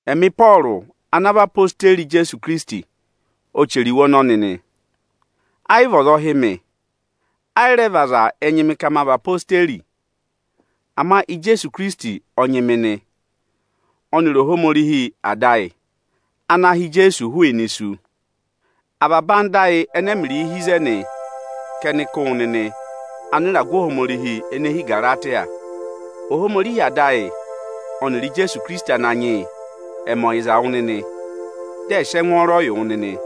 Ẹmị Ịpọọrụ ana vị odeyi Ijeesu Ikirisiti ọ chẹrẹ iwe ọnọnị nị. Ẹ yị vị ọza ọ hị́ mị, ẹ yị rẹ vị aza ẹ nyị mị ka ma vị odeyi. Ama Ijeesu Ikirisiti ọ nyị mị nị, ọnịrị Ohomorihi Ada ayị, ana ha Ijeesu hụụnị isu. Avaba ẹyịnyara ayị ẹnẹ ẹmịrịị hi ịzẹnị ka ẹnị kụ́ wụ nịnị anịragụ Ohomorihi ene hi Ịgaratịya. Ohomorihi Ada ayị ọnịrị Ijeesu Ikirisiti Ananyị yị ẹ̀ mẹ ọyịza wụ nịnị, dị ẹ̀ sị ẹngwọọrọ yị wụ nịnị!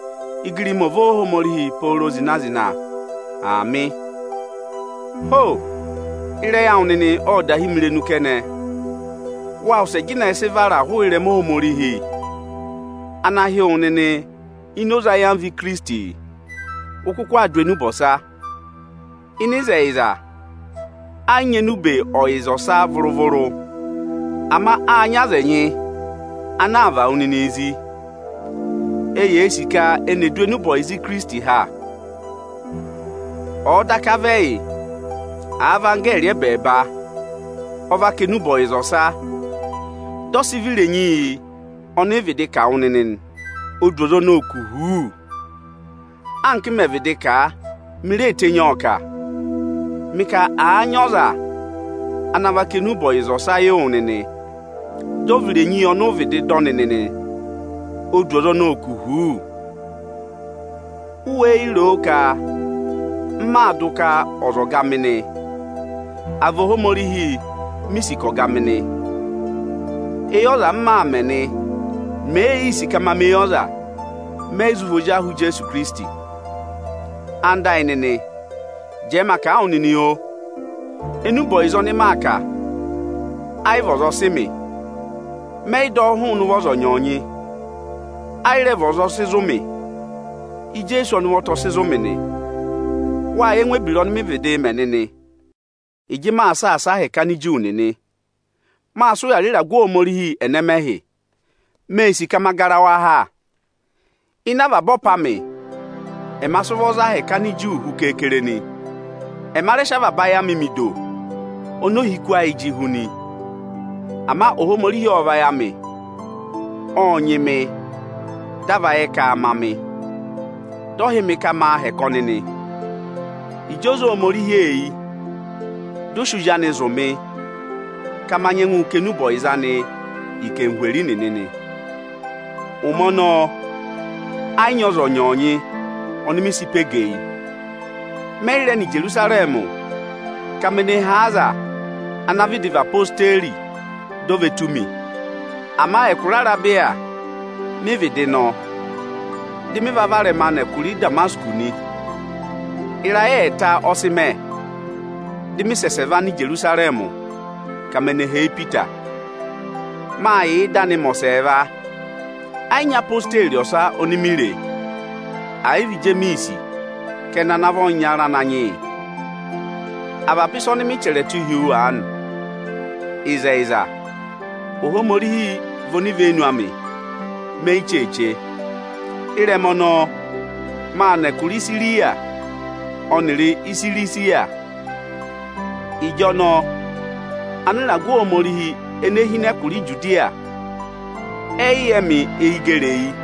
Igirima ọ̀ vị Óohomorihi pooro zịna-zịna! Aamị. Ho! Ịrẹyị awụ nịnị ọ́ọ da hí mi irenu kẹnẹ! Wáa wụsẹ jịnẹ sị và hụrẹ ịrẹma Ohomorihi ana hị́ wụ nịnị ini oze ayamva Ikirisiti, ụ kụkụ aa dụ enube ọsa. Ịnị ịzẹyịza, ẹ yị nyị enube ọyịza ọsa vụrụ-vụrụ; ama áa nyị aza ẹnyị ana aa và wụ nịnị zí, eyee sì ka eni è du enube ọyịza Ikirisiti ha. Ọ̀ọ daka vị ẹyị, àa vị anggẹẹrị ẹbẹẹba ọ va kà enube ọyịza ọsa, dị ọ sị vị irenyi yị ọnị ị vịdị kà wụ nịnị nị, o du ọza ọnọọ kù huuu! Anka m mẹ̀ vịdị kà a, mi ree tenyi ọọ kà: Mị ka, àa nyị ọza ana va kà enube ọyịza ọsa yị wụ nịnị, dị ọ vị irenyi yị ọnị ụ vịdị dọ nịnị nị, o du ọza ọnọọ kù huuu! U wéé yi ro ka m maa dụ ka ọza ọ̀ọ ga mị nị, à vị Ohomorihi mi sì ka ọ̀ọ ga mị nị? Eyi ọza m maa mẹ̀ nị? Mèe yii sì ka ma mẹ eyi ọza, mẹ yị zụ vị ozi ahụ Ijeesu Ikirisiti. Ẹwụ nịnị ẹyịnyara amị, jẹẹ ma kà a wụ nịnị oo, enube ọyịza ọnị maa kà, ẹ yị vị ọza ọ sị mị. Mẹ yị dọ ọ hụụnị ụvọ ọza ọnyọọnyị, ẹ yị rẹ vị ọza ọ sị zụ̀ mị. Ijeesu ọnị ụvọta ọ sị zụ̀ mị nị. Wáa yẹ ẹngụ ebira ọnị mịị̄ vịdịị mẹ ịjị maa saasa ahẹkẹ Aniju nịnị. Máa sị ụya rị ịragụ Ohomorihi ẹnẹmẹhị; máa sị vụrị ẹtẹẹtẹrẹ ka ma gara a ha. Ịnị avaba ọpa amị, ẹma sị ụvọ za ahẹkẹ Aniju hu kere-kere nị. Ẹma rẹ sị avaba ayị amị mẹ ido oni ohiku ayị jị hu nị. Ama Ohomorihi ọ́ọ vayị amị, ọ́ọ nyị mị di a va yẹ ka aa ma mị, dị ọ hị́ mị ka maa hẹkẹ ọnị nị. Ịjị o zé Ohomorihi eyi, dị ọ sị Ozi anị zụ̀ mị ka ma nyẹngụ kà enube ọyịza anị yị anarịmadọwụ nịnị nị. Ụmẹ ọnọọ ẹ yị nyị ọza ọnyọọnyị oni mi sị pe gẹ eyi. Mẹ yị rẹ nọ Ijerusarẹmị ka me ne hee aza ana vịdị vị odeyi di o ve tù mi. Ama ẹkụra Arebiya mị vịdị nọ, dị mị varẹma vẹ ẹkụra Ịdamasịkọsị nị. Ịrayị ẹẹta ọ sị mẹ, dị mị va nọ Ijerusarẹmị ka me ne hee Ipita. Máa yà ịda anị mẹ ẹkụhị ẹwụrẹhị. Ẹ yị nyị odeyi ọsa oni mi re, àyị vị Ijemiisi kẹnẹ ana vị ọyịnyara Ananyị yị. Avaba ịsa ọnị mị chẹrẹ tụ́ hi wu aanị vị ịzẹyịza. Ohomorihi vị onivenu amị ka me yi cheeche. Ịrẹma ọnọọ, máa nọ ẹkụra Isiriya ọnịrị Isirisiya. Ịjọnọọ anịragụ Ohomorihi ene hi ịnị ẹkụra Ijudiya, ẹ yị yẹ mị eyi gẹrị eyi.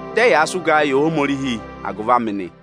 Dị ẹyaa sị ụgaa yị Ohomorihi agụvị amị nị.